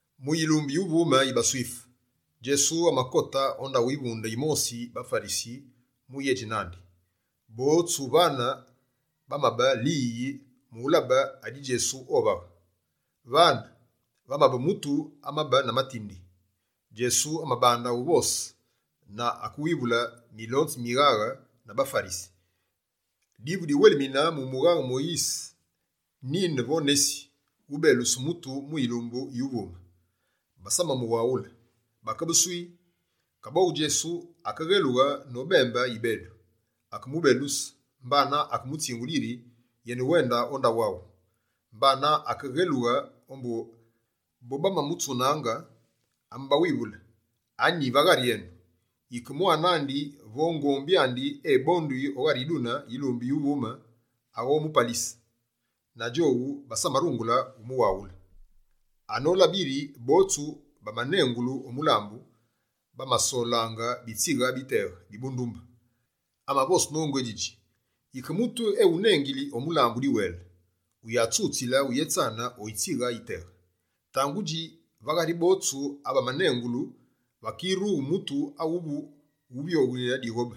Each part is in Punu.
Mu yilumbu yuvume yi baSwife, Djesu amakote o ndaghu yivunde yimosi yi baFarisi mu uyédji nandi. Botsu vane bamabe liyiyi mu ulabe adi Djesu ovaghe. Vane, vamabe mutu amabe na matindi. Djesu amabande uvose na akewivule milonzi mi mighaghe na baFarisi: «Divu diwelimine mu mughaghe Moyise, nine vo nesi, ubeluse mutu mu yilumbu yuvume?» Basamamuwaghule, bakebe «swii». Kaboghu Djesu akeghelughe nobembe yibedu, akemubeluse mbana akemutsingule yiri yenewende o ndaghu andi. Mbana akeghelughe ombu bobamamutsunaange, amabawivule: «Anyi va ghari enu, yike mwane andi vo ngombi andi ebonduyi o ghari yidune yilumbu yuvume, aghomupalise?» Na djowu basamarungule umuwaghule. Anolabe yiri botsu bamanengulu o mulambu, bamasolaange bitsighe biteghe bi bundumbe, amavose nongu édjidji: «Yike mutu ewunengili o mulambu diwele, wuyatsutsile uyétsane o yitsighe yiteghe. Tangudji, va ghari botsu abamanengulu vakirughe mutu awu wuvyoghe dighobe,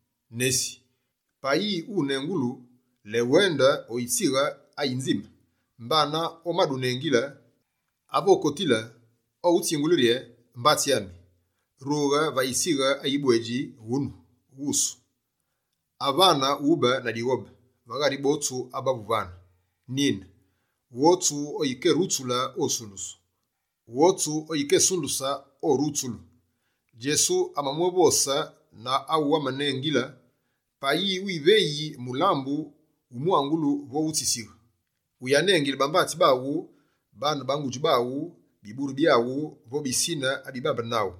Nesi, payi unengulu, léwende o yitsighe ayinzime. Mbana omadunengile, ave okotile, oghutsingule rye: “Mbatsi ami, rughe va yitsighe ayi bwedji wunu wusu.” Avane, wube na dighobe va ghari botsu abavu vane. Nine, Wotsu oyikerutsule, osundusu. Wotsu oyikesunduse, orutsulu.» Djesu amamwévose na awu amamunengile: «Payi wiveyi mulambu wu mwangulu vo wu tsisighe, uyanengile bambatsi baghu, baane ba ngudji baghu, biburu byaghu vo bisine abibambene naghu.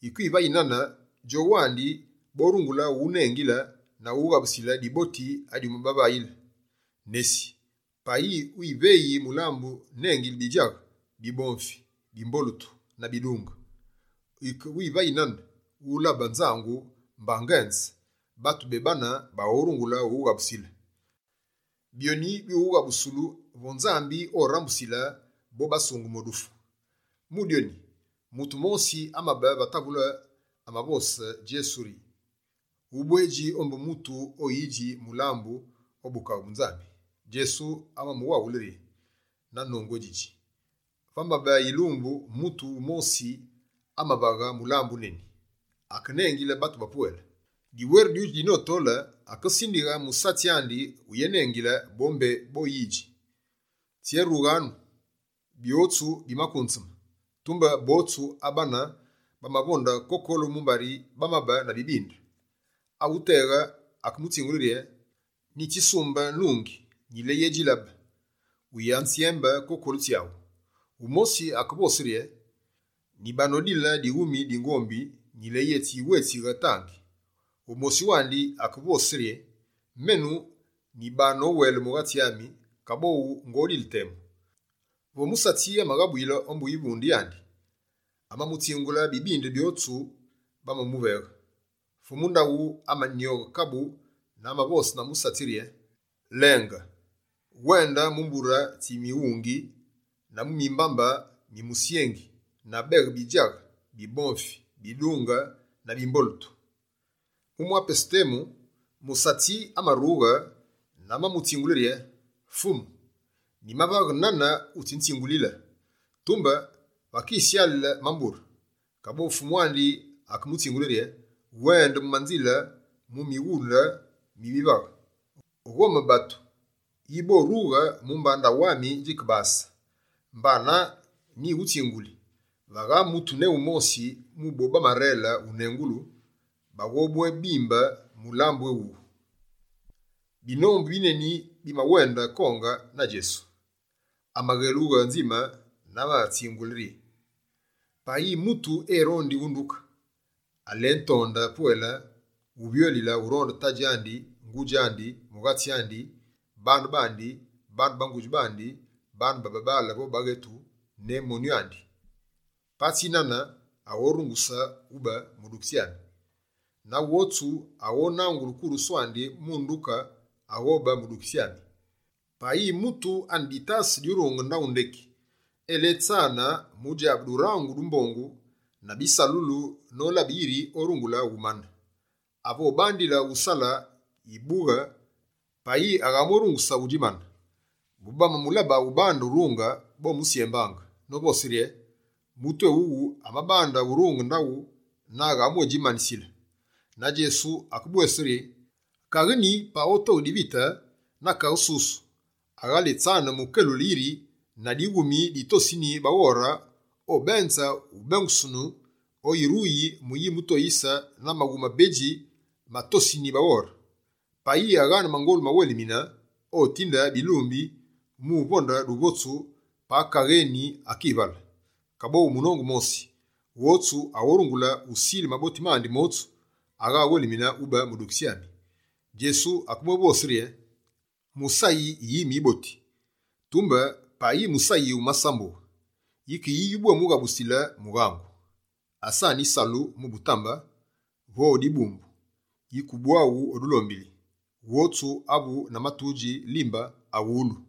Yike wivayi nane, djowu wandi borungule uwunengile na uwughabusile diboti adiwumabavaghe. Nesi, payi wiveyi mulambu, nengile bidjaghe, bibomfi, bimbolutu na bidunge. Yike wivayi nane, wulabe nzangu mba ngenze, batu bebane baghorungule uwughabusile. Byonyi byuwughabusulu vo Nzambi orambusile bo basungeme o dufu.» Mu dyoni, mutu mosi amabe va tavule amavosile Djesu rye: «Ubwedji ombu mutu owudji mulambu o Bukaghe bu Nzambi!» Djesu amamuwaghule na nongu édjidji rye: «Vamabe yilumbu, mutu wumosi amavaghe mulambu wuneni. Akenengile batu bapwele. Diweru dyudji dinotole, akesindighe musatsi andi uyenengile bo mbé boyidji: “Tsyérughyanu, byotsu bimakunzeme!” Tumbe botsu abane, bamavonde kokolu mumbari bamabe na bibinde. Awuteghe akemutsingule rye: “Nyitsisumbe nungi, nyileyedjilabe. Wuyanzyembe, kokolu tsyaghu.” Wumosi akevose rye: “Nyibenodile dighumi di ngombi, nyileyetsi wétsighe, tandi.” Wumosi wandi akemwévose: “Menu nyibonowele mughatsi ami, kaboghu ngodile temu.” Vo musatsi amaghabuyile ombu yivunde yandi, amamutsingule bibinde byotsu bamamuveghe. Fumu ndaghu amanyoghe kabu na amavose na musatsi rye: Lenge! Wende mu mbure tsi mughungi na mu mimbambe mi musyengi na beghe bidjaghe, bibomfi, bidunge na bimbolutu! Mu mwa pesu temu, musatsi amarughe na amamutsingule rye: “Fumu, nyimavaghe nane wutsinzingulile, tumbe vakisyale mambure.” Kaboghu fumu andi akemutsingule rye: “Wende mu manzile, mu mighule bivaghe, ghome batu yi borughe mumba ndaghu ami djikebase. Mbana nyighutsinguli, vagha mutu ne wumosi mu bo bamarele unengulu, baghobwémimbe mulambu éwuwu!”» Binombu bineni bimawenda konge na Djesu. Amaghelughe nzime na amabitsingule rye: «Payi mutu erondi unduke, aletonde pwele wuvyolile uronde tadji andi, ngudji andi, mughatsi andi, baane bandi, baane ba ngudji bandi, babaale vo baghetu, ne monyu andi. Patsi nane, aghorunguse ube mudukitsi ami. Na wotsu aghonangule kurusu andi mu unduke, aghobe mudukitsi ami. Payi mutu ane ditase dyurunge ndaghu ndeki, eletsane mu djabe durangu du mbongu na bisalulu nolabe yiri orungule umane. Ave obandile usale yibughe payi aghamwérunguse udjimane, bobamamulabe ubande urunge, bomusyembaange, novose rye: “Mutu éwuwu amabande urunge ndaghu na aghamwédjimanisile!”» Na Djesu akebwévose rye: «Kaghe nyi, payi otoghe divite na kaghe susu, aghéletsane mu kelule yiri na dighumi di tosini baghore obenze uyébengusunu oyiruyi mu yimutoyise na maghumi mabedji ma tosini baghore? Payi aghaane mangolu mawelimine, otinde bilumbi mu uvonde duvotsu pa kaghe eni akivale! Kaboghu munongu mosi, wotsu aghorungule usile maboti mandi motsu, agha awelimine ube mudukitsi ami.» Djesu akebwévose rye: «Musayi yime yiboti, tumbe payi musayi wumasambughe, yike yi yubwémughabusile mughangu? Asane yisalu mu butambe vo o dibumbu, yike ubwaghu o dulombili. Wotsu avu na matudji limbaa, awulu!»